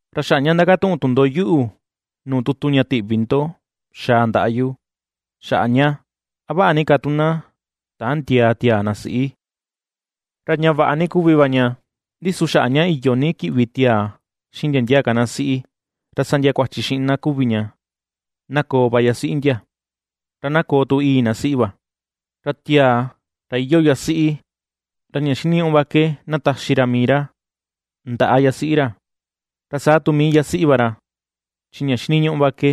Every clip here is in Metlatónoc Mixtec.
Ra xaꞌa ña ndakatuꞌun tu ndo yuꞌu nuu tutu ña tiꞌvi ndo ^xaa ndaꞌa yu, xaꞌa ña “a vaꞌa ni ka tu na tändiaa tiaa na siꞌi”. Ra ña vaꞌa ni kuvi va ña, ndi su xaꞌa ña iyo ini kiꞌvi tiaa xiꞌin ndia ndia ka na siꞌi, ra sa ndia kuachi xiꞌin na kuvi ña, na koo va yasiꞌi ndia, ra na koo tu ìi̱ na siꞌi va. Ra tiaa, ra iyoo yasiꞌi, ra ña xiniñuꞌu va ke na taxi ra mii ra ndaꞌa yasiꞌi ra, ra saa tu mii yasiꞌi va ra, chi ña xiniñuꞌu va ke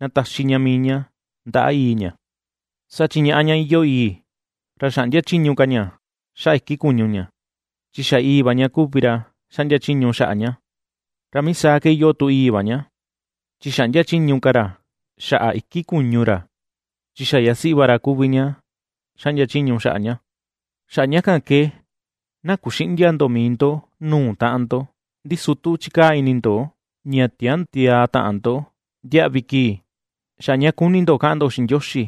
na taxi ña mii ña ndaꞌa ìi̱ ña. Saa chi ñaꞌá ña iyoo ìi̱, ra xäꞌndia chiñu ka ña xaꞌa iki kuñu ña, chi xa ìi̱ va ña kuvi ra xaꞌndia chiñu xaꞌa ñá. Ra mii saa ke iyoo tu ìi̱ va ña, chi xäꞌndia chiñu ka ra xaꞌa iki kuñu ra, chi xa yasiꞌi va ra kuvi ña xaꞌndia chiñu xaꞌa ñá. Xaꞌa ña kan ke na kuxïꞌndia ndo mii ndo nuu taꞌan ndo, Ndi su tu chikaa ini ndo ña tiändiaa taꞌan ndo ndiaꞌvi kii, xaꞌa ña kuni ndo kaꞌan ndo xiꞌin Ndioxi,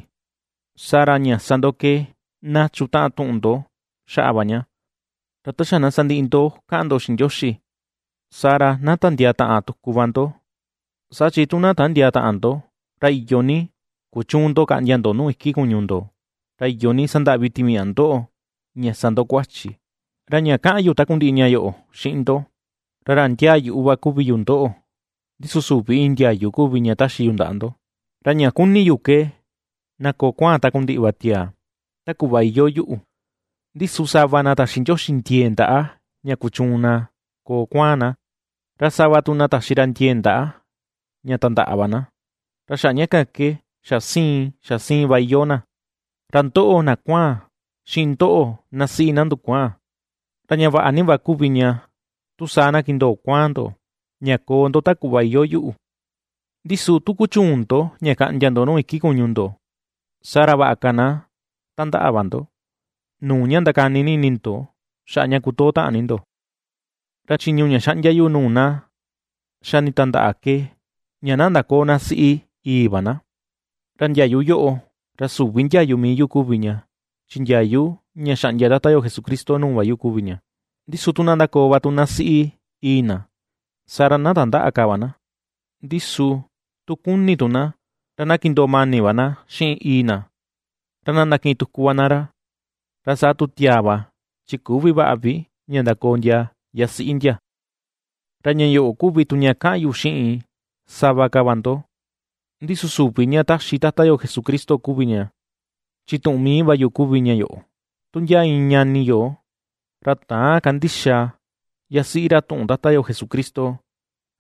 saa ra ña sa ndo ke na chutaꞌan tuꞌun ndo xaꞌa va ña. Ra ta xa na sandiꞌi ndo kaꞌan ndo xiꞌin Ndioxi, saa ra na ndatandiaa taꞌan tuku va ndo; saa chi tu na tändiaa taꞌan ndo, ra iyo ni kuchüun ndo kaꞌndia ndo nuu iki kuñu ndo, ra iyo ni sandaꞌvi timiaꞌa ndoꞌo ña sa ndo kuachi. Ra ña kaꞌan yu takundiꞌi ña yoꞌo xiꞌin ndo, ra ra ndiaa yuꞌu va kuvi yu ndoꞌo, ndi su süvi iin ndiayu kuvi ña taxi yu ndaꞌa ndo. Ra ña kuni̱ yu ke, na koo kuaan takundiꞌi va tiaa, ta kuꞌva iyoo yuꞌu; ndi su sava na taxi Ndioxi ndiee ndaꞌa ña kuchuun na koo kuaan na, ra sava tu na taxi ra ndiee ndaꞌa ña tandaꞌa va na, ra xaꞌa ña kan ke xa siin xa siin va iyoo na. Ra ndoꞌo na kuaan, xiꞌin ndoꞌo na siꞌi na ndukuaan, ra ña vaꞌa ni va kuvi ña, tu saa na kindoo kuaan ndo, ña koo ndo ta kuꞌva iyoo yuꞌu. Ndi su tu ^kuchüun ndo ña kaꞌndia ndo nuu iki kuñu ndo, saa ra vaꞌa ka na tandaꞌa va ndo, nuu ña ndakani ni ini ndo xaꞌa ña kutoo taꞌan ni ndo. Ra chiñu ña xaꞌndia yu nuu na xa nitandaꞌa ke, ña na ndaköo ná siꞌi ìi̱ va na. Ra ndiayu yoꞌo, ra süvi ndiayu mii yu kuvi ña, chi ndiayu ña xaꞌndia Tata yo Jesucristo nuu va yo kuvi ña. Ndi su tu na ndakoo va tu na siꞌi ìi̱ na, saa ra na tandäꞌa ka va na, ndi su tu kuni tu na, ra na kindoo mani va na xiꞌin ìi̱ na, ra na ndakiꞌin tuku va na ra. Ra saa tu tiaa va chi küvi vaꞌa vi ña ndakoo ndia yasiꞌi ndia. Ra ña yoꞌo kuvi tu ña kaꞌan yu xiꞌin sava ka va ndo, ndi su süvi ña ^taxi Tata yo Jesucristo kuvi ña, chi tuꞌun mii va yu kuvi ña yoꞌo: tu ndia iin ñani yo, ra täan kandixa yasiꞌi ra tuꞌun Tata yo Jesucristo,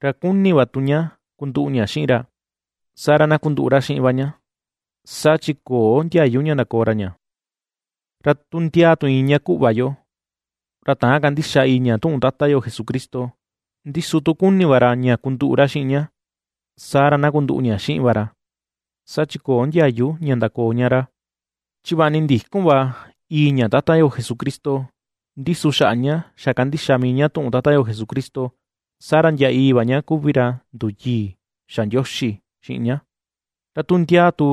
ra kuni va tu ña kunduꞌu ña xiꞌin ra, saa ra na kunduꞌu ra xiꞌin va ña, saa chi köo ndiayu ña ndakoo ra ña. Ra tu ndia tu iin ña kuꞌva yo, ra täan kandixa ìi̱ ña tuꞌun Tata yo Jesucristo, ndi su tu kuni va ra ña kunduꞌu ra xiꞌin ña, saa ra na kunduꞌu ña xiꞌin va ra, saa chi köo ndiayu ña ndaköo ña ra. Chi vaꞌa ni ndïkun va ìi̱ ña Tata yo Jesucristo, ndi su xaꞌa ña ^xa kandixa mii ña tuꞌun Tata yo Jesucristo, saa ra ndia ìi̱ va ña kuvi ra nduyii xa Ndioxi xiꞌin ña; ra tu ndia tu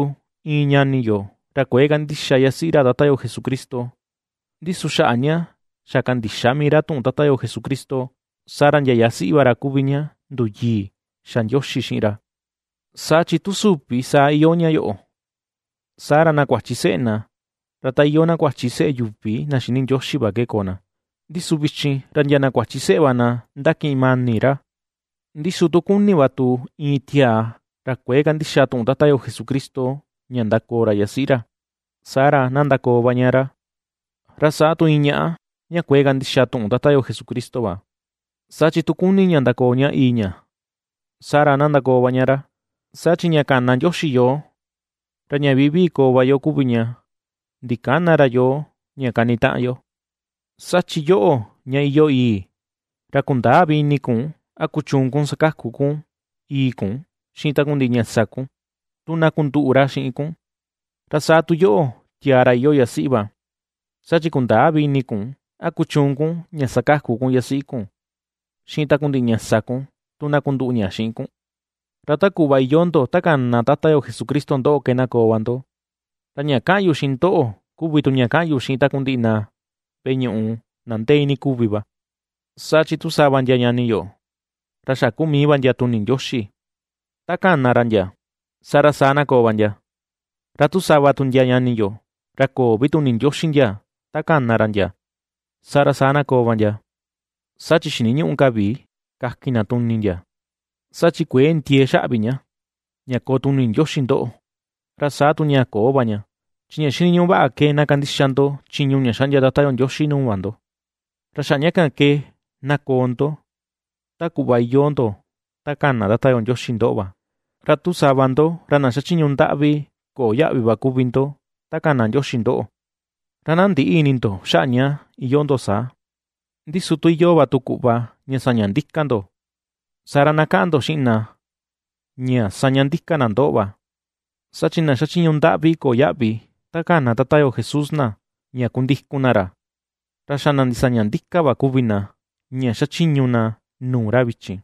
iin ñani yo ra kuëe kandixa yasiꞌi ra Tata yo Jesucristo, ndi su xaꞌa ña ^xa kandixa mii ra tuꞌun Tata yo Jesucristo, saa ra ndia yasiꞌi va ra kuvi ña nduyii xa Ndioxi xiꞌin ra. Saa chi tu süvi saa iyoo ña yoꞌo, saa ra na kuachi seꞌe na ra ta iyoo na kuachi seꞌe yuvi na xïni Ndioxi va ke koo na, ndi su vichin ra ndia na kuachi seꞌe va na ^ndakiꞌin mani ra. Ndi su tu kuni va tu iin tiaa ra kuëe kandixa tuꞌun Tata yo Jesucristo ña ndakoo ra yasiꞌi ra, saa ra na ndakoo va ña ra, ra saa tu iin ñaꞌa, ña kuëe kandixa tuꞌun Tata yo Jesucristo va, saa chi tu kuni ña ndakoo ña ìi̱ ña, saa ra na ndakoo va ña ra. Saa chi ña kana Ndioxi yoo, ra ña vivii koo va yo kuvi ña, ndikäna ra yoo ña kanitaꞌan yo. Saa chi yoꞌo ña iyoo ìi̱, ra kundäa vi ini kun a kuchuun kun sakaku kun ìi̱ kun xiꞌin takundiꞌi ña sa kun, tu na kunduꞌu ra xiꞌin kun; ra saa tu yoꞌo, tiaa ra iyoo yasiꞌi va, saa chi kundäa vi ini kun a kuchuun kun ña sakaku kun yasiꞌi kun xiꞌin takundiꞌi ña sa kun, tu na kunduꞌu ña xiꞌin kun. Ra ta kuꞌva iyoo ndo, ta kana Tata yo Jesucristo ndoꞌo ke na koo va ndo. Ra ña kaꞌan yu xiꞌin ndoꞌo, kuvi tu ña kaꞌan yu xiꞌin takundiꞌi na veꞌe ñuꞌu na ndee iinii kuvi va. Saa chi tu sava ndia ñani yo, ra xa kuu mii va ndia tuni Ndioxi ta kana ra ndia, saa ra, saa na koo va ndia, ra tu sava tu ndia ñani yo, ra köo vi tuni Ndioxi ndia ta kana ra ndia, saa ra saa na koo va ndia, chi xiniñüꞌu ka vi ña kakin na tuni ndia. Saa chi kuëe ndiee xaꞌa vi ña, ña koo tuni Ndioxi ndoꞌo, ra saa tu ña köo va ña, chi ña xiniñuꞌu vaꞌa ke na kandixa ndo chiñu ña xaꞌndia Tata yo Ndioxi nuu va ndo. Ra xaꞌa ña kan ke na koo ndo ta kuꞌva iyoo ndo ta kana Tata yo Ndioxi ndoꞌo va. Ra tu sava ndo, ra na xachiñu ndaꞌvi köo yaꞌvi va kuvi ndo, ta kana Ndioxi ndoꞌo, ra na ndïꞌi ini ndo xaꞌa ña iyoo ndo saa; ndi su tu iyoo va tu kuꞌva ña saña ndika ndo, saa ra na kaꞌan ndo xiꞌin na, ña ^saña ndika na ndoꞌo va. Saa chi na xachiñu ndaꞌvi köo yaꞌvi, ta kana Tata yo Jesús na ña kundikun na ra, ra xa na ndisaña ndika va kuvi na ña xachiñu na nuu ra vichin;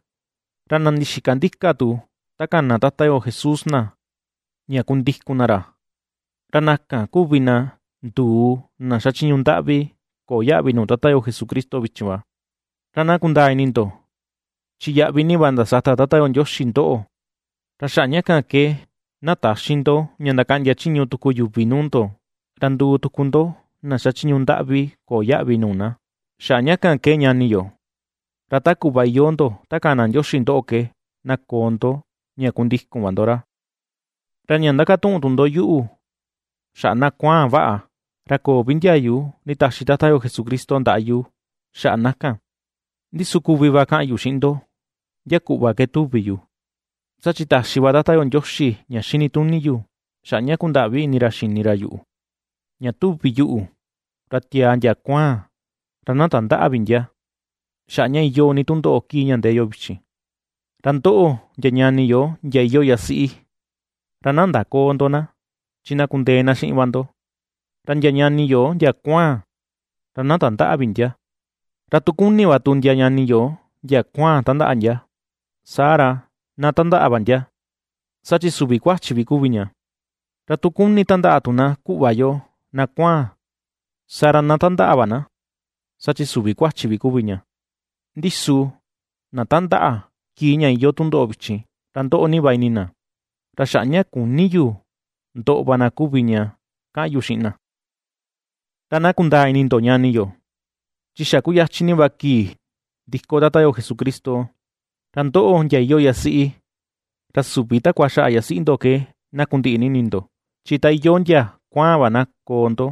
ra na ndixika ndika tu ta kana Tata yo Jesús na ña kundikun na ra, ra na kan kuvi na nduu na xachiñu ndaꞌvi köo yaꞌvi nuu Tata yo Jesucristo vichin va. Ra na kundaa ini ndo, chi yaꞌvi ni va ndasata Tata yo Ndioxi ndoꞌo; ra xaꞌa ña kan ke na täxi ndo ña ndakaꞌndia chiñu tuku yuvi nuu ndo, ra nduu tuku ndo na xachiñu ndaꞌvi köo yaꞌvi nuu na. Xaꞌa ña kan ke ñani yo, ra ta kuꞌva iyoo ndo ta kana Ndioxi ndoꞌo ke na koo ndo ña kundikun va ndo ra. Ra ña ndakatuꞌun tu ndo yuꞌu xaꞌa na kuaan vaꞌa, ra köo vi ndiayu nditaxi Tata yo Jesucristo ndaꞌa yu xaꞌa na, ndi su kuvi va kaꞌan yu xiꞌin ndo ndia kuꞌva ke tuvi yu, saa chi taxi va Tata yo Ndioxi ña xini tuni yu, xaꞌa ña kundaꞌvi ni ini ra xini yuꞌu. Ña tuvi yuꞌu, ra tiaa ndia kuaan, ra na tandäꞌa vi ndia, xaꞌa ña iyoo ni tundoꞌo kii ña ndee yo vichin. Ra ndoꞌo, ndia ñani yo ndia iyoo yasiꞌi, ra na ndaköo ndo ná, chi na kundee na xiꞌin va ndo; ra ndia ñani yo, ndia kuaan, ra na tandäꞌa vi ndia. Ra tu kuni va tu ndia ñani yo ndia kuaan tandaꞌa ndia, saa ra na tandaꞌa va ndia, saa chi süvi kuachi vi kuvi ña; ra tu kuni tandaꞌa tu na kuꞌva yo na kuaan, saa ra na tandaꞌa va na, saa chi süvi kuachi vi kuvi ña. Ndi su na ^tandaꞌa, kii ña iyoo tundoꞌo vichin, ra ^ndoꞌo ni va na, ra xaꞌa ña küni yu ndoꞌo va na kuvi ña kaꞌan yu xiꞌin na. Ra na kundaa ini ndo, ñani yo: Chi xa kuyachin ni va kii ndiko Tata yo Jesucristo, ra ndoꞌo, ndia iyoo yasiꞌi, ra süvi takua xaꞌa yasiꞌi ndo ke na kundiꞌi ni ini ndo, chi ta iyoo ndia kuaan va na koo ndo;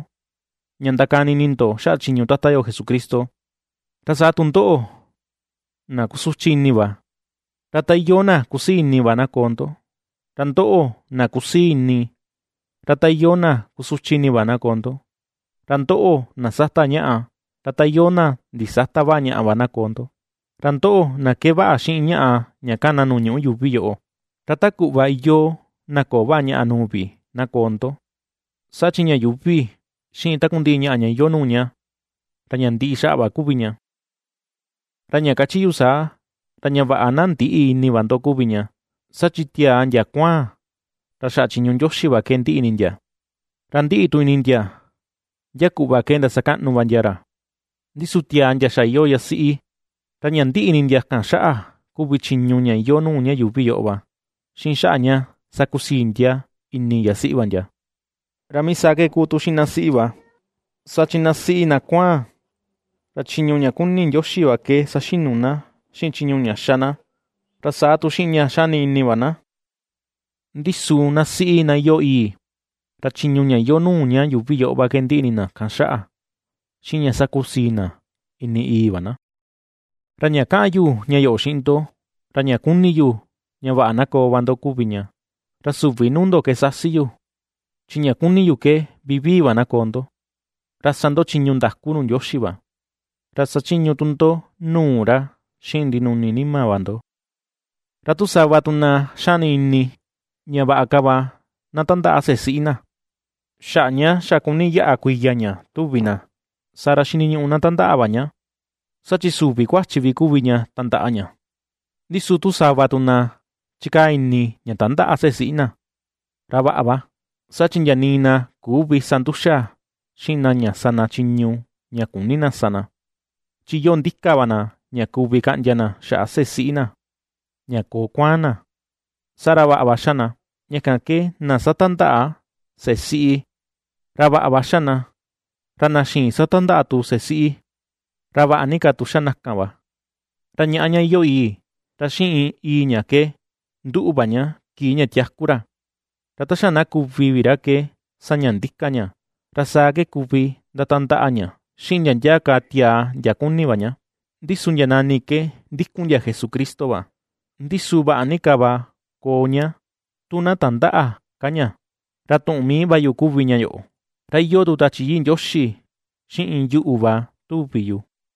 ña ndakani ini ndo xaꞌa chiñu Tata yo Jesucristo ra saa tu ndoꞌo, na kusuchi ini va, ra ta iyoo na kusii ini va na koo ndo; ra ndoꞌo na kusii ini, ra ta iyoo na kusuchi ini va na koo ndo; ra ndoꞌo na ^sata ñaꞌa, ra ta iyoo na ndisäta vaꞌa ñaꞌa va na koo ndo; ra ndoꞌo, na kee vaꞌa xiꞌin ñaꞌa ña kana nuu ña yuuvi yoꞌo, ra ta kuꞌva iyoo na köo vaꞌa ñaꞌa nuu vi na koo ndo; saa chi ña yuuvi, xiꞌin takundiꞌi ñaꞌa ña iyoo nuu ña, ra ña ndiꞌi xaꞌa va kuvi ña. Ra ña kachi yu saa, ra ña vaꞌa na ndïꞌi ni ini va ndo kuvi ña. Saa chi tiaa ndia kuaan, ra xaꞌa chiñu Ndioxi va ke ndiꞌi ini ndia, ra ndiꞌi tu ini ndia ndia kuꞌva ke ndasakaꞌnu va ndia ra; ndi su tiaa ndia xa iyoo yasiꞌi, ra ña ndiꞌi ini ndia kan xaꞌa kuvi chiñu ña iyoo nuu ña yuuvi yoꞌo va, xiꞌin xaꞌa ña sakusii ndia ini yasiꞌi va ndia. Ra mii saa ke kuu tu xiꞌin ná siꞌi va, saa chi na siꞌi ná kuaan, ra chiñu ña kuni Ndioxi va ke saxinu na, xiꞌin chiñu ña xa na, ra saa tu xiꞌin ña xani ini va na; ndi su na siꞌi na iyoo ìi̱, ra chiñu ña iyoo nuu ña yuuvi yoꞌo va ke ndiꞌi ini na kan xaꞌa, xiꞌin ña sakusii na ini ìi̱ va na. Ra ña kaꞌan yu ña yoꞌo xiꞌin ndo, ra ña kuni yu ña vaꞌa na koo va ndo kuvi ña, ra süvi nuu ndo ke sasi yu, chi ña kuni yu ke vivii va na koo ndo, ra ^sa ndo chiñu ndaku nuu Ndioxi va, ra sachiñu tu ndo nuu ra xiꞌin ndinuni nima va ndo. Ra tu sava tu na xani ini, ña vaꞌa ka va na tandaꞌa seꞌe siꞌi na, xaꞌa ña xa kuni yaꞌa kuiya ña tuvi na, saa ra xiniñuꞌu na tandaꞌa va ña, saa chi süvi kuachi vi kuvi ña tandaꞌa ña. Ndi su tu sava tu na chikaa ini ña tandäꞌa seꞌe siꞌi na, ra vaꞌa va, saa chi ndiaa nii na küvi sa nduxa xiꞌin na ña sa na chiñu ña küni na sa na, chi iyoo ndika va na ña kuvi kaꞌndia na xaꞌa seꞌe siꞌi na, ña koo kuaan na, saa ra vaꞌa va xa na. Ña kan ke na satandaꞌa seꞌe siꞌi, ra vaꞌa va xa na, ra na xïin satandaꞌa tu seꞌe siꞌi, ra vaꞌa ni ka va tu xa na kan. Ra ñaꞌa ña iyoo ìi̱, ra xiꞌin ìi̱ ña ke nduꞌu va ña kii ña tiaku ra, ra ta xa na kuvi vi ra ke saña ndika ña, ra saa ke kuvi ndatandaꞌa ña xiꞌin ndia ndia ka tiaa ndia kuni va ña, ndi su ndia nani ke ndikun ndia Jesucristo va. Ndi su vaꞌa ni ka va koo ña, tu na ndatandäꞌa ka ña. Ra tuꞌun mii va yu kuvi ña yoꞌo, ra iyoo tu Tachi Yii Ndioxi xiꞌin yuꞌu va tuvi yu.